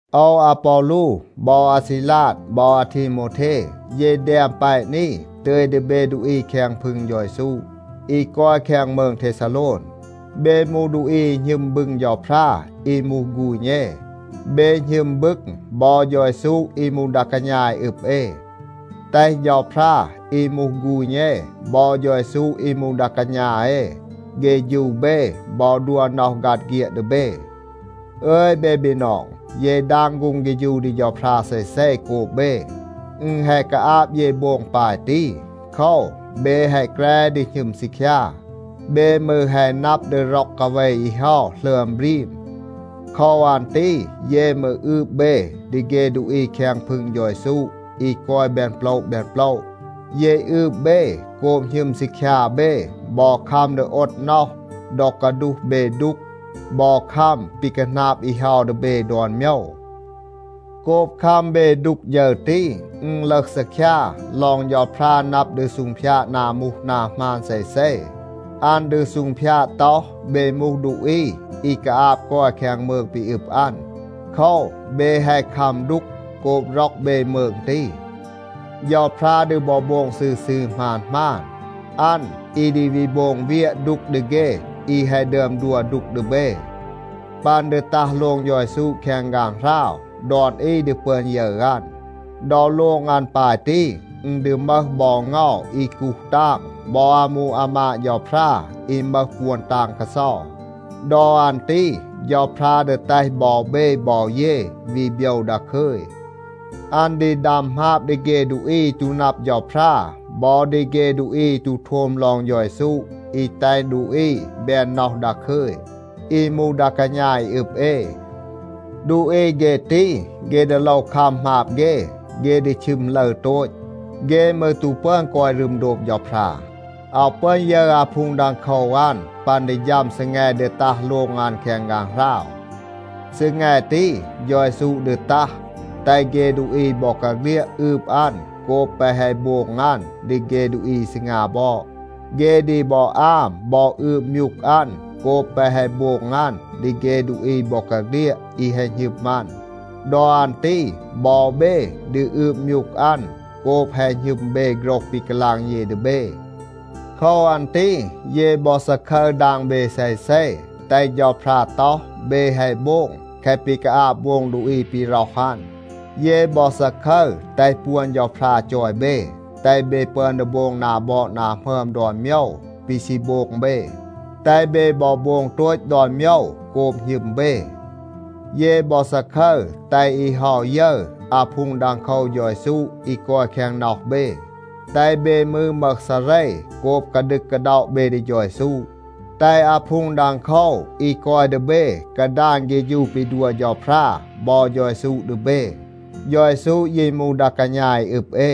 โอว อาปอลู บอ อาซีลาด บอ อาทีโมวเท, เย แดม แปะ นี, ตึย ดี เบ ดูอี แคง พึง เฌา เยซู อี กอย แคง มืง เทซาโลน. เบ มูห ดูอี อี หณึม บึง เฌาพรา อี มูห ฆูณ เอ. เบ หณึม บึง บอ เฌา เยซู อี มูห ดา กาณา อี อึบ เอ. แตห เฌาพรา อี มูห ฆูณ เอ บอ เฌา เยซู อี มูห ดา กาณา เอ เฆฌู เบ บอ ดัว น็อห ฆัด เฆียด ดี เบ. อึย เบ บีนอง, เย ดาง ฆูง เฆฌู ดี เฌาพรา เซเซ โกบ เบ. อึณ แฮะ กาอาบ เย โบง ปาย ตี. โคว, เบ แฮะ แกร ดี หณึม ซีคยา. เบ มืร แฮะ นับ ดี ร็อก กาเว อี เฮา หลึอม บรีม. โคว อัน ตี เย มืร อืบ เบ ดี เฆ ดูอี แคง พึง เฌา เยซู อี กอย แบน โปละ แบน โปละ. เย อืบ เบ โกบ หณึม ซีคยา เบ บอ คัม ดี โอด น็อห ดอ กาดูห เบ ดูก บอ คัม ปี คาหนาบ อี เฮา ดี เบ ดอน โมยว. โกบ คัม เบ ดูก ฌึร ตี, อึณ ลึห ซีคยา ลอง เฌาพรา นับ ดี ซูงพยาด นา มูห นา หมาน เซเซ. อัน ดี ซูงพยาด ต็อห, เบ มูห ดูอี อี กาอาบ กอย แคง มืง ปี อึบ อัน. โคว, เบ แฮะ คัม ดูก โกบ ร็อก เบ มืง ตี. เฌาพรา ดี บอ โบง ซืร ซืร หมาน หมาน. อัน อี ดี วี โบง เวียะ ดูก ดี เฆ อี แฮะ ดึอม ดัว ดูก ดี เบ. ปัน ดี ตัห โลง เฌา เยซู แคง ฆางหราว, ดอน อี ดี ปึอน ยึร อัน. ดอ โลง อัน ปาย ตี, อึณ ดี มึห บอ เงา อี กูห ตาง บอ อามู อามาด เฌาพรา อี มึห ปวน ตาง กาเซา. ดอ อัน ตี เฌาพรา ดี แตห บอ เบ บอ เย วี โบยว ดาคึย. อัน ดี ดัม หมาบ ดี เฆ ดูอี อี ตู นับ เฌาพรา บอ ดี เฆ ดูอี อี ตู โทม ลอง เฌา เยซู อี แตห ดูอี แบน น็อห ดาคึย, อี มูห ดา กาณา อี อึบ เอ. ดูอี เฆ ตี, เฆ ดี โลว คัม หมาบ เฆ. เฆ ดี ชึม ลึร โตต. เฆ มืร ตู ปึอน กอย รึม โดบ เฌาพรา, อาว ปึอน ยึร อาพูง ดังโคว อัน ปัน ดี ฌัม ซีแง ดี ตัห โลง อัน แคง ฆางหราว. ซีแง ตี, เฌา เยซู ดี ตัห, แตห เฆ ดูอี บอกาเฆลียด อืบ อัน โกบ แปะ แฮะ โบง อัน ดี เฆ ดูอี อี ซีงา บอด. เฆ ดี บอ อาม บอ อืบ มยูก อัน โกบ แปะ แฮะ โบง อัน ดี เฆ ดูอี บอกาเฆลียด อี แฮะ หณึม อัน. ดอ อัน ตี บอ เบ ดี อืบ มยูก อัน โกบ แฮะ หณึม เบ โฆรห ปี กาลาง เย ดี เบ. โคว อัน ตี เย บอ ซาคึร ดาง เบ เซเซ, แตห เฌาพรา ต็อห, เบ แฮะ โบง แคะ ปี กาอาบ โบง ดูอี ปี ร็อห อัน. เย บอ ซาคึร แตห ปวน เฌาพรา จอย เบ, แตห เบ ปึอน ดี โบง นา บอด นา หมึอม ดอน โมยว ปี ซี โบง เบ. แตห เบ บอ โบง โตต ดอน โมยว โกบ หณึม เบ. เย บอ ซาคึร แตห อี เฮา ยึร อาพูง ดังโคว เฌา เยซู อี กอย แคง น็อห เบ. แตห เบ มืร มึห ซาเร โกบ กาดึก กาด็อะ เบ ดี เฌา เยซู. แตห อาพูง ดังโคว อี กอย ดี เบ กาดาน เฆฌู ปี ดัว เฌาพรา บอ เฌา เยซู ดี เบ. เฌา เยซู ยี มูห ดา กาณา อี อึบ เอ.